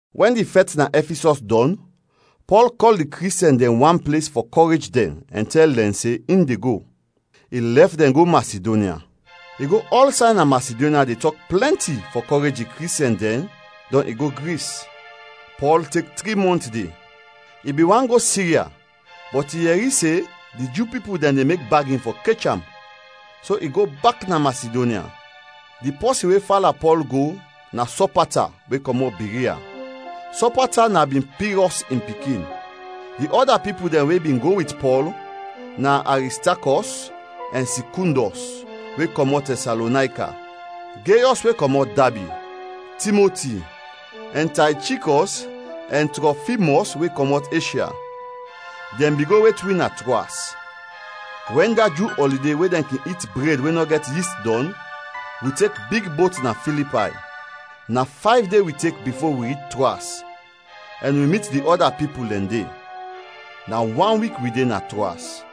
Wɛn di fɛt na Ɛfisɔs dɔn, Pɔl kɔl di Kristiɛn dɛn wan ples fɔ kɔrej dɛn ɛn tɛl dɛn se in de go. I lɛf dɛn go Masidonya. I go ɔlsay na Masidonya de tɔk plɛnti fɔ kɔrej di Kristiɛn dɛn, dɔn i go Gris. Pɔl tek tri mɔnt de. I bin want go Sirya bɔt i yɛri se di Ju pipul dɛn de mek bagin fɔ kech am so i go bak na Masidonya. Di pɔsin we fala Pɔl go na Sɔpata we kɔmɔt Biria. Sɔpata na bin Pirɔs in pikin. Di ɔda pipul dɛn we bin go wit Pɔl na Aristakɔs ɛn Sikundɔs, we kɔmɔt Tɛsalonayka; Geyɔs we kɔmɔt Dabi; Timoti; ɛn Taychikɔs ɛn Trɔfimɔs we kɔmɔt Eshya. Dɛn bin go wet wi na Troas. Wɛn da Ju ɔlide we dɛn kin it bred we nɔ gɛt yist, dɔn, wi tek big bot na Filipay. Na fayv de wi tek bifo wi rich Troas ɛn wi mit di ɔda pipul dɛn de. Na wan wik wi de na Troas.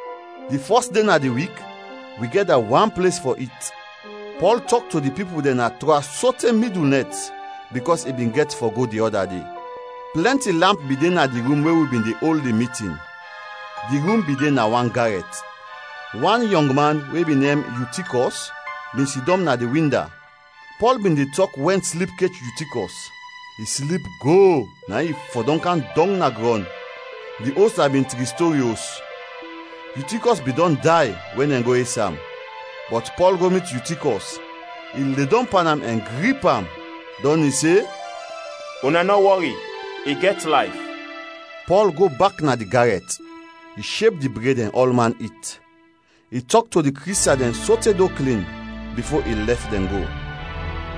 Di fɔs de na di wik, wi gɛda wan ples fɔ it. Pɔl tɔk to di pipul dɛn na Troas sote midul nɛt bikɔs i bin gɛt fɔ go di ɔda de. Plɛnti lamp bin de na di rum we wi bin de ol di mitin. Di rum bin de na wan garɛt. Wan yɔngman we bin nem Yutikɔs bin sidɔm na di winda. Pɔl bin de tɔk wɛn slip kech Yutikɔs. I slip go, na in i fɔdɔm kam dɔng na grɔn. Di os na bin tri stori os. Yutikɔs bin dɔn day wɛn dɛn go es am. Bɔt Pɔl go mit Yutikɔs, i ledɔm pan am ɛn grip am, dɔn i se, “Una nɔ wɔri, i gɛt layf!” Pɔl go bak na di garɛt, i sheb di bred ɛn ɔlman it. I tɔk to di Kristiɛn dɛn sote do klin, bifo i lɛf dɛn go.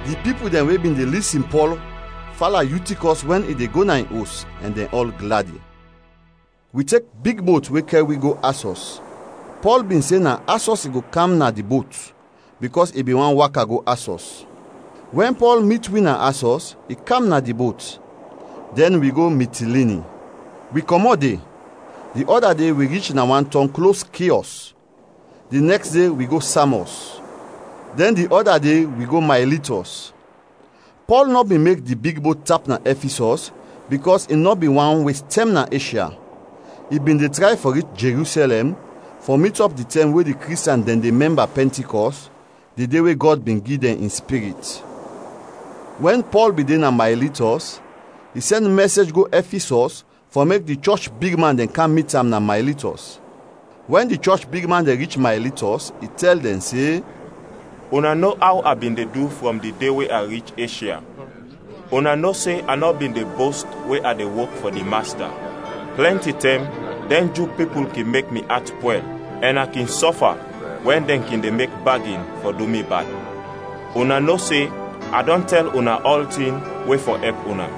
Di pipul dɛn we bin de lisin Pɔl fala Yutikɔs wɛn i de go na in os ɛn dɛn ɔl gladi. Wi tek big bot we kɛr wi go Asɔs, Pɔl bin se na Asɔs i go kam na di bot, bikɔs i bin want waka go Asɔs. Wɛn Pɔl mit wi na Asɔs, i kam na di bot, dɛn wi go Mitilini. Wi kɔmɔt de; di ɔda de wi rich na wan tɔng klos Kiɔs, di nɛks de wi go Samɔs, dɛn di ɔda de wi go Maylitɔs. Pɔl nɔ bin mek di big bot tap na Ɛfisɔs bikɔs i nɔ bin want wes tɛm na Eshya. I bin de tray fɔ rich Jerusɛlɛm fɔ mit ɔp di tɛm we di Kristiɛn dɛn de mɛmba Pɛntikɔst, di de we Gɔd bin gi dɛn in Spirit. Wɛn Pɔl bin de na Maylitɔs, i sɛn mɛsej go Ɛfisɔs fɔ mek di chɔch bigman dɛn kam mit am na Maylitɔs. Wɛn di chɔch bigman dɛn rich Maylitɔs, i tɛl dɛn se, “Una no aw a bin de du frɔm di de we a rich Eshya. Una no se a nɔ bin de bost we a de wok fɔ di Masta. Plɛnti tɛm dɛn Ju pipul kin mek mi at pwɛl ɛn a kin sɔfa wɛn dɛn kin de mek bagin fɔ du mi bad. Una no se a dɔn tɛl una ɔltin we fɔ ɛp una.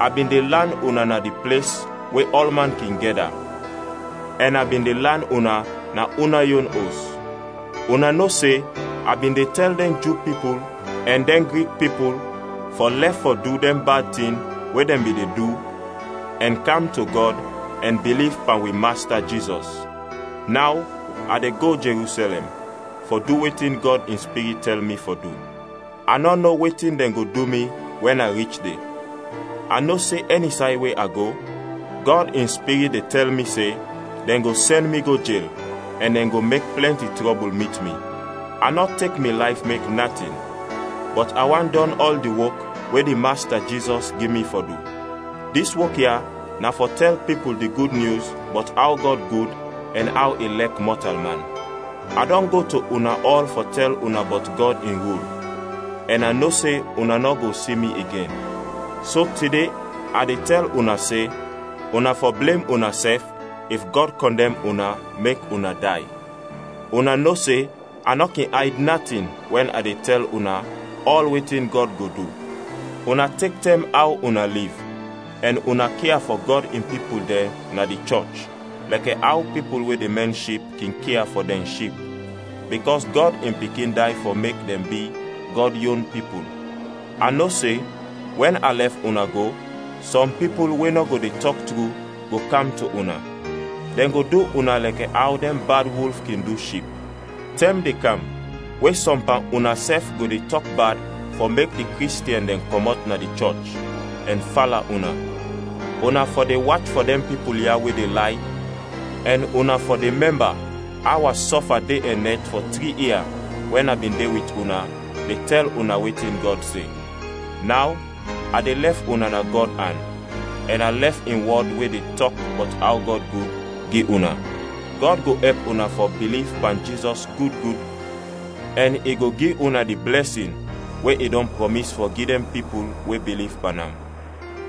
A bin de lan una na di ples we ɔlman kin gɛda, ɛn a bin de lan una na una yon os. Una no se a bin de tɛl dɛn Ju pipul ɛn dɛn Grik pipul fɔ lɛf fɔ du dɛn bad tin we dɛn bin de du ɛn kam to Gɔd ɛn biliv pan wi Masta Jizɔs. Naw, a de go Jerusɛlɛm fɔ du wetin Gɔd in Spirit tɛl mi fɔ du. A nɔ no wetin dɛn go du mi wɛn a rich de. A no se ɛni say we a go, Gɔd in Spirit de tɛl mi se dɛn go sɛn mi go jel ɛn dɛn go mek plɛnti trɔbul mit mi. A nɔ tek mi layf mek natin, bɔt a want dɔn ɔl di wok we di Masta, Jizɔs gi mi fɔ du. Dis wok ya na fɔ tɛl pipul di Gud Nyus bɔt aw Gɔd gud ɛn aw i lɛk mɔtalman. “A dɔn go to una ɔl fɔ tɛl una bɔt Gɔd in rul ɛn a no se una nɔ go si mi igen. So tide a de tɛl una se una fɔ blem unasɛf if Gɔd kɔndɛm una mek una day. Una no se a nɔ kin ayd natin wɛn a de tɛl una ɔl wetin Gɔd go du. Una tek tɛm aw una liv ɛn una kia fɔ Gɔd In pipul dɛn na di chɔch lɛkɛ aw pipul we de mɛn ship kin kia fɔ dɛn ship, bikɔs Gɔd in Pikin day fɔ mek dɛn bi Gɔd yon pipul. A no se wɛn a lɛf una go, sɔm pipul we nɔ go de tɔk tru go kam to una. Dɛn go du una lɛkɛ aw dɛn bad wulf kin du ship. Tɛm de kam we sɔm pan unasɛf go de tɔk bad fɔ mek di Kristiɛn dɛn kɔmɔt na di chɔch ɛn fala una. Una fɔ de wach fɔ dɛn pipul ya we de lay ɛn una fɔ de mɛmba aw a sɔfa de ɛn nɛt fɔ tri ia wɛn a bin de wit una de tɛl una wetin Gɔd se. “Naw a de lɛf una na Gɔd an ɛn a lɛf in wɔd we de tɔk bɔt aw Gɔd gud, gi una. Gɔd go ɛp una fɔ biliv pan Jizɔs gud gud ɛn I go gi una di blɛsin we i dɔn prɔmis fɔ gi dɛn pipul we biliv pan am.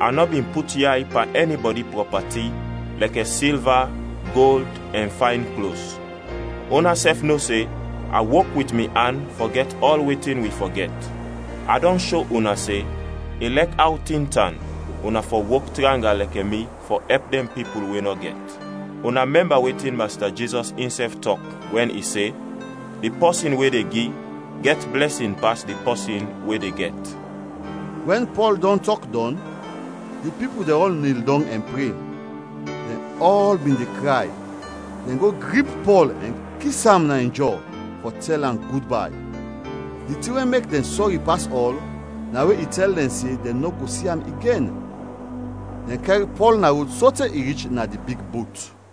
A nɔ bin put yay pan ɛnibɔdi prɔpati lɛkɛ silva, gold ɛn fayn klos. Unasɛf no se a wok wit mi an fɔ gɛt ɔl wetin wi fɔ gɛt. A dɔn sho una se ilɛk aw tin tan una fɔ wok tranga lɛkɛ mi fɔ ɛp dɛn pipul we nɔ gɛt. Una mɛmba wetin Masta Jizɔs insɛf tɔk wɛn i se, ‘Di pɔsin we de gi gɛt blɛsin pas di pɔsin we de gɛt.’” Wɛn Pɔl dɔn tɔk dɔn, di pipul dɛn ɔl nil dɔng ɛn pre. Dɛn ɔl bin de kray; dɛn go grip Pɔl ɛn kis am na in jɔ fɔ tɛl am gudbay. Di tin we mek dɛn sɔri pas ɔl na we i tɛl dɛn se dɛn nɔ go si am igen. Dɛn kɛr Pɔl na rod sote i rich na di big bot.